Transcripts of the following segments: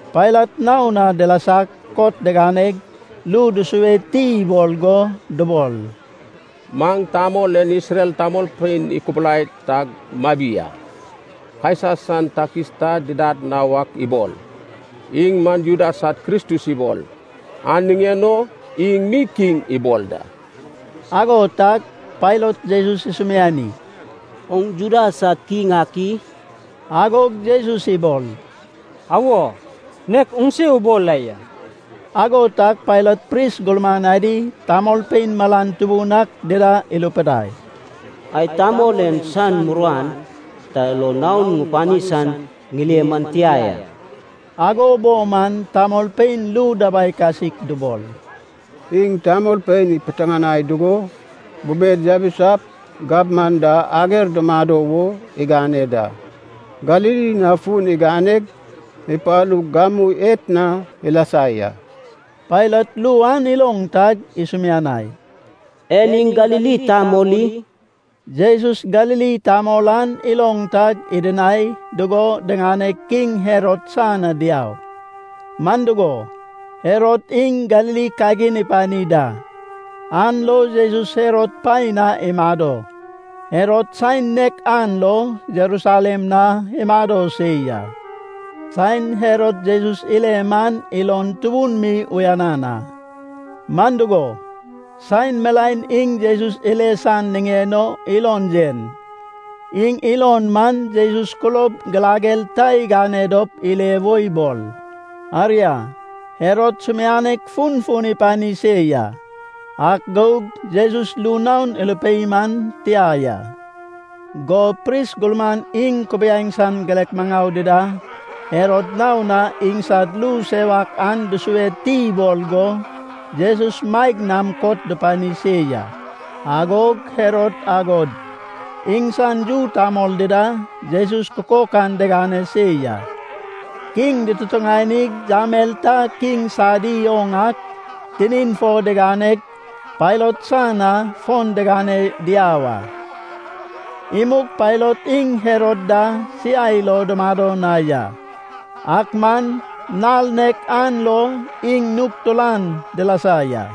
Pailat naon na dilasag kot diganeg, ru dusue ti ibol go dubol, “Maŋ tamol en Isrel tamolpein ikubulai tag mabi a. Kaisa san takis ta didad na wak ibol. Iŋ man Juda sad Kristus ibol, an niŋen o iŋ mi kiŋ ibol da.” Ago tag Pailat Jesus isumiani, “Oŋ Juda sad kiŋ ak i?” Agog Jesus ibol, “Awo, nek oŋse ubol la ya.” Ago tag Pailat pris gurman adi, tamolpein malan tubun ak dida irupidai, “Ŋai tamol en san muruan ta lo naon ŋupani san ŋile man tia ya.” Ago bo man tamolpein ru dabai kasik dubol, “Iŋ tamolpein ipiteŋanai dugo bubed yabisap gabman da ager dumado wo igane da. Galili na fun iganeg, ipalug gamu etna ilasa ya.” Pailat ru an iloŋ tag isumianai, “En iŋ Galili tamol i?” Jesus Galili tamol an iloŋ tag, idinai dugo diŋaneg kiŋ Herod san na diau. Man dugo, Herod iŋ Galili kagin ipani da, an lo Jesus Herod paen na imado. Herod saen nek an lo Jerusalem na imado se ya. Saen Herod Jesus ile man ilon tubun mi uyanan a. Man dugo, saen milaen iŋ Jesus ile san niŋen o ilon yen. Iŋ ilon man Jesus kulob girager ta igane dop ile wo ibol. Aria, Herod sumianek funfun ipani se ya, ak gug Jesus ru naon irupei man tia ya. Go pris gurman iŋ kubiaeŋ san girek maŋau dida Herod naon na iŋsad ru sewak an dusue ti ibol go Jesus maeg nam kot dupani se ya. Agog Herod agod iŋsan yu tamol dida Jesus kukokan digane se ya. Kiŋ dututuŋanig yamel ta kiŋ sadi oŋ ak tinin fo diganeg Pailat san na fon diŋane diau a. Imug Pailat iŋ Herod da siai lo dumado na ya. Ak man nal nek an lo iŋ nug turan dilasa ya.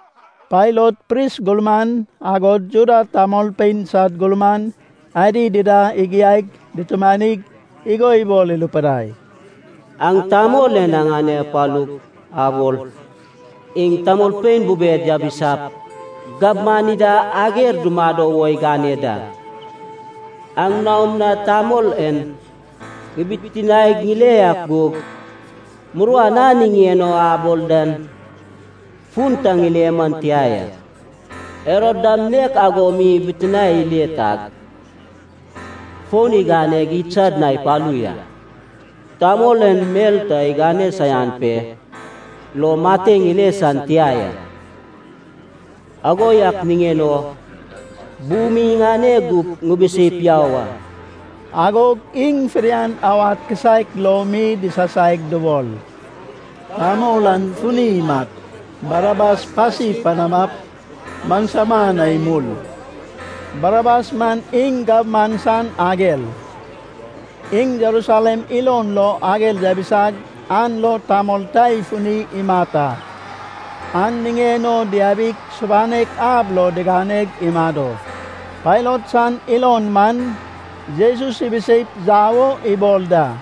Pailat pris gurman, agod Juda tamolpein sad gurman adi dida igiaig dutumanig igo ibol irupidai, “Aŋ tamol en aŋane apalug abol, iŋ tamolpein bubed yabisap gabman ida ager dumado wo igane da. Aŋ naom na tamol en ŋibitinaeg ŋile ak gug, muruan a niŋen o abol dan fun ta ŋile man tia ya. Herod dam nek ago mi ibitinae ile tag, fon iganeg idsad na ipalu ya. Tamol en mel ta igane saian pe lo mateŋ ile san tia ya. Ago yak niŋen o bu mi iŋane gup ŋibiseip yau a.” Agog iŋ fidian awad kisaek lo mi disasaig dubol, “Tamol an funi imat. Barabas pasi panamap maŋsama na imul!” (Barabas man iŋ gabman san ager. Iŋ Jerusalem ilon lo ager yabisag an lo tamol ta ifuni imat a. An niŋen o diabig subanek ab lo diganeg imado.) Pailat san ilon man, Jesus ibiseip yau o ibol da,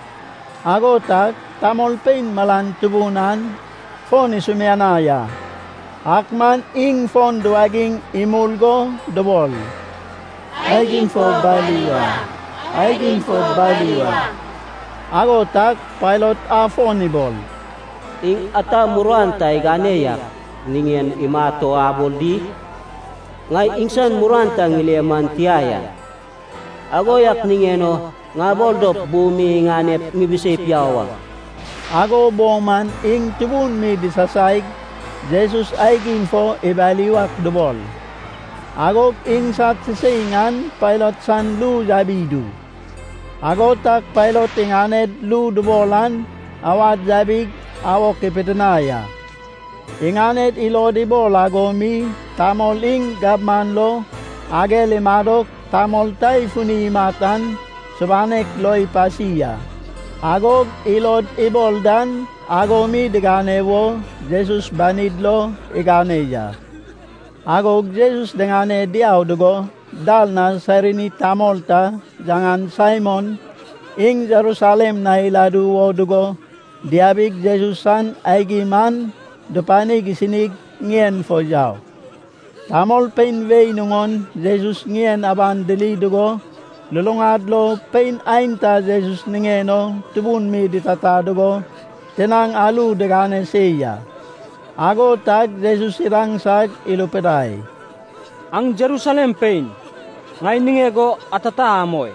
ago tag tamolpein malan tubun an fon isumianai a. Ak man iŋ fon duwagiŋ imul go dubol, “Aigim fo bali wa! Aigim fo bali wa!” Ago tag Pailat afon ibol, “Iŋ ata muruan ta igane yak niŋen imat o abol di? Ŋai iŋsan muruan ta ŋile man tia ya. Ago yak niŋen o ŋabol dop bu mi iŋanep ŋibiseip yau a.” Ago bo man iŋ tubun mi disasaig, Jesus aigim fo ibali wak dubol. Agog iŋsad siseiŋ an Pailat san ru yabi idu. Ago tag Pailat iŋaned ru dubol an awad yabig awok ipidinai a. Iŋaned ilod ibol ago mi tamol iŋ gabman lo ager imadog tamol ta ifuni imat an subanek lo ipasi a. Agog ilod ibol dan ago mi digane wo Jesus banid lo igane ya. Agog Jesus diŋane diau dugo dal na Sairini tamol ta yaŋan Saimon iŋ Jerusalem na iladu wo dugo diabig Jesus san aigim an dupanig isinig ŋien fo yau. Tamolpein wei nuŋon Jesus ŋien aban diri dugo, luluŋad lo pein aenta Jesus niŋen o tubun mi ditata dugo tinaŋ aru digane se ya. Ago tag Jesus idaŋsag irupidai, “Aŋ Jerusalem pein, ŋai niŋeg o atata amoi.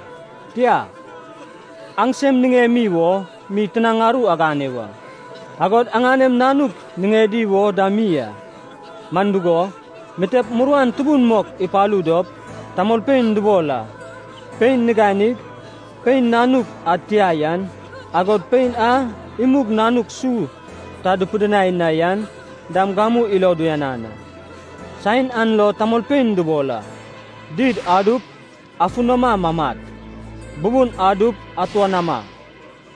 Tia, aŋsem niŋemi wo mi tinaŋ aru agane wa, agod aŋanem nanuk niŋedi wo dam mi a. Man dugo, mitep muruan tubun mok ipalu dop tamolpein dubol a, ‘Pein niganig, pein nanuk ad tia yan, agod pein a imug nanuk su ta dupidinai na yan dam gamu ilod uyanan a.’ Saen an lo tamolpein dubol a, ‘Did adup, afunama mamat. Bubun adup, atuanama!’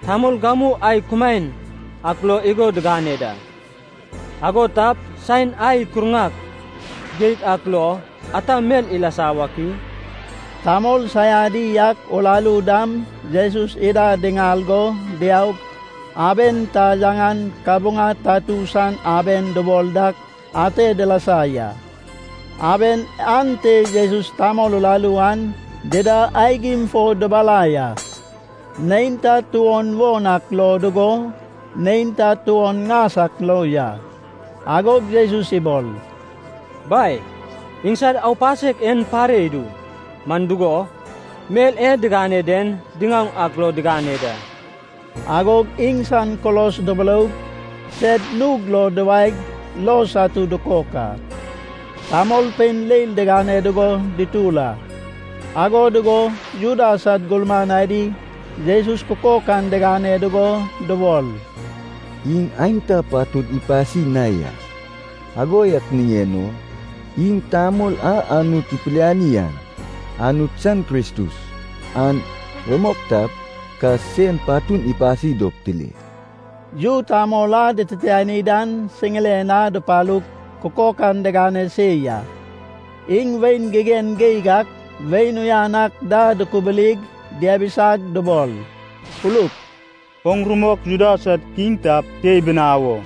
Tamol gamu ai kumaen ak lo igo digane da. Ago tap, saen ai ikurŋak geig ak lo, ata mel ilasa wak i?” Tamol saiadi ak uraru dam Jesus ida diŋal go diaug aben ta, yaŋan Kabuŋa Tatu san aben dubol dak, ate dilasa ya. Aben ante Jesus tamol uraru an dida aigim fo dubalai a. Neinta tuon won ak lo dugo, neinta tuon ŋas ak lo ya. Agog Jesus ibol, “Bai, iŋsad aupasek en pare idu, man dugo, mel e digane den diŋaoŋ ak lo digane da.” Agog iŋsan kulos duburoug, sed nug lo duwaeg lo satu dukok a. Tamolpein leil digane dugo dutur a, ago dugo Juda sad gurman adi Jesus kukokan digane dugo dubol, “Iŋ aenta patud ipasi na ya. Ago yak niŋen o, iŋ tamol a Anut ipiliani an, Anut san Kristus, an rumok tap, ka sen patun ipasi dop tile.” Yu tamol a dititiani dan siŋiren na dupalug kukokan digane se ya. Iŋ wain gigen geig ak wain uyan ak da dukubulig diabisag dubol, “Uluk. Oŋ rumok Juda sad kiŋ tap, se ibinawo!”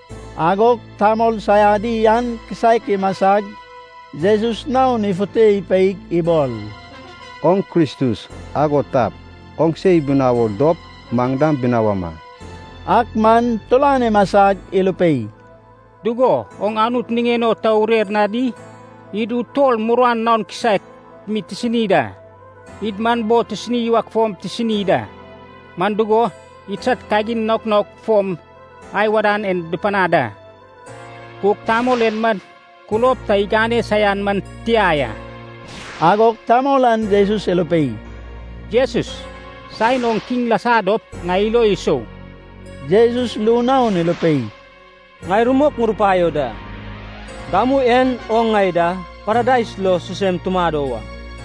Agog tamol saiadi an kisaek imasag Jesus naon ifute ipeig ibol, “Oŋ Kristus. Ago tap, oŋse ibinawo dop, maŋ dam binawama!” Ak man turan imasag irupei, “Dugo, oŋ Anut niŋen o ta urer na di? Id utol muruan naon kisaek mi tisini da. Id man bo tisini wak fom tisini da. Man dugo, idsad kagin naok naok fom ai wadan en dupanad a. Gug tamol en man kulob ta igane saian man tia ya.” Agog tamol an Jesus irupei, “Jesus, saen oŋ kiŋ lasa dop, ŋai ilo isou.” Jesus ru naon irupei, “Ŋai rumok ŋurupaio da, gamu en oŋ ŋai da Paradais lo sisem tumado wa.”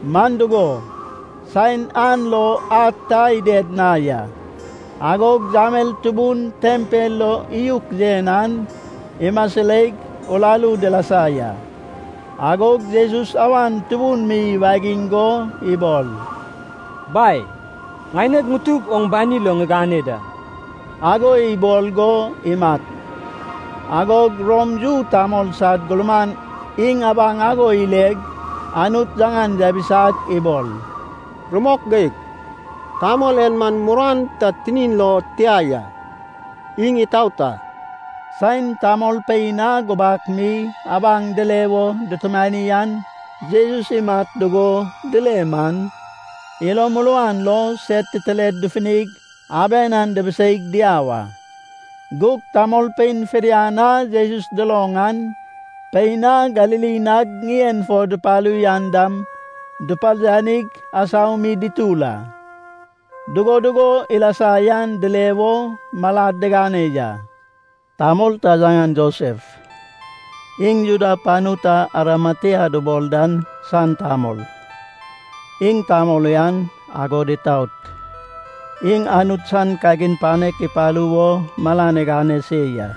Man dugo, saen an lo ad ta ided na ya. Agog yamel tubun tempel lo iyuk yen an, imasireig uraru dilasa ya. Agog Jesus awan tubun mi iwagiŋ go ibol, “Bai, ŋaineg ŋutug oŋ bani lo ŋigane da.” Ago ibol go imat. Agog Rom yu tamol sad gurman iŋ abaŋ ago ileg, Anut yaŋan yabisag ibol, “Rumok geig. Tamol en man muruan ta tinin lo tia ya. Iŋ itaot a.” Saen tamolpein a gubak mi abaŋ dile wo dutumani an Jesus imat dugo dile man, ilo muruan lo sed titired dufunig aben an dibiseig diau a. Gug tamolpein fidian a Jesus duloŋ an, pein a Galili nag ŋien fo dupalu yan dam, duparianig asau mi dutur a. Dugo dugo ilasa yan dile wo malad digane ya. Tamol ta yaŋan Josef, iŋ Juda panu ta Arimatia dubol dan san tamol. Iŋ tamol uyan, agod itaot. Iŋ Anut san kagin panek ipalu wo malan igane se ya.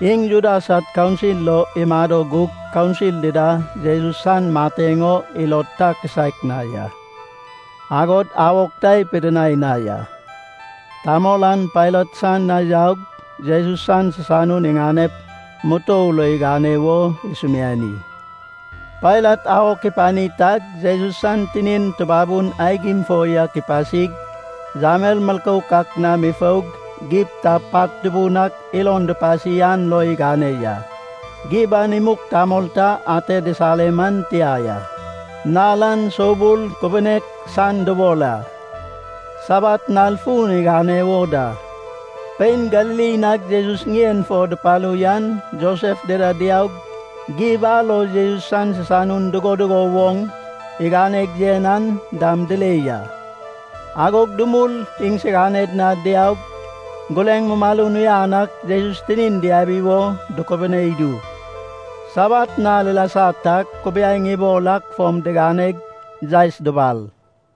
Iŋ Juda sad kaunsil lo imado gug kaunsil dida Jesus san mateŋ o ilod ta kisaek na ya, agod awok ta ipidinai na ya. Tamol an Pailat san na yaug, Jesus san sisanun iŋanep mutou lo igane wo isumiani. Pailat awok ipani tag Jesus san tinin tubabun aigim fo yak ipasig, yamel milkouk ak nam ifoug, gib ta pat tubun ak ilon dupasi an lo igane ya. Gib an imug tamol ta ate disare man tia ya. Nal an Soubul Kubunek San dubol a. Sabat nal fun igane wo da. Pein Galili nag Jesus ŋien fo dupalu yan Josef dida diaug, gib a lo Jesus san sisanun dugo dugo woŋ iganeg yen an dam dile ya. Agog dumul, iŋsiganed na diaug, gureŋ mumalun uyan ak Jesus tinin diabi wo dukubune idu. Sabat nal ilasa tag kubiaeŋ ibol ak fom diganeg, yaes dubal.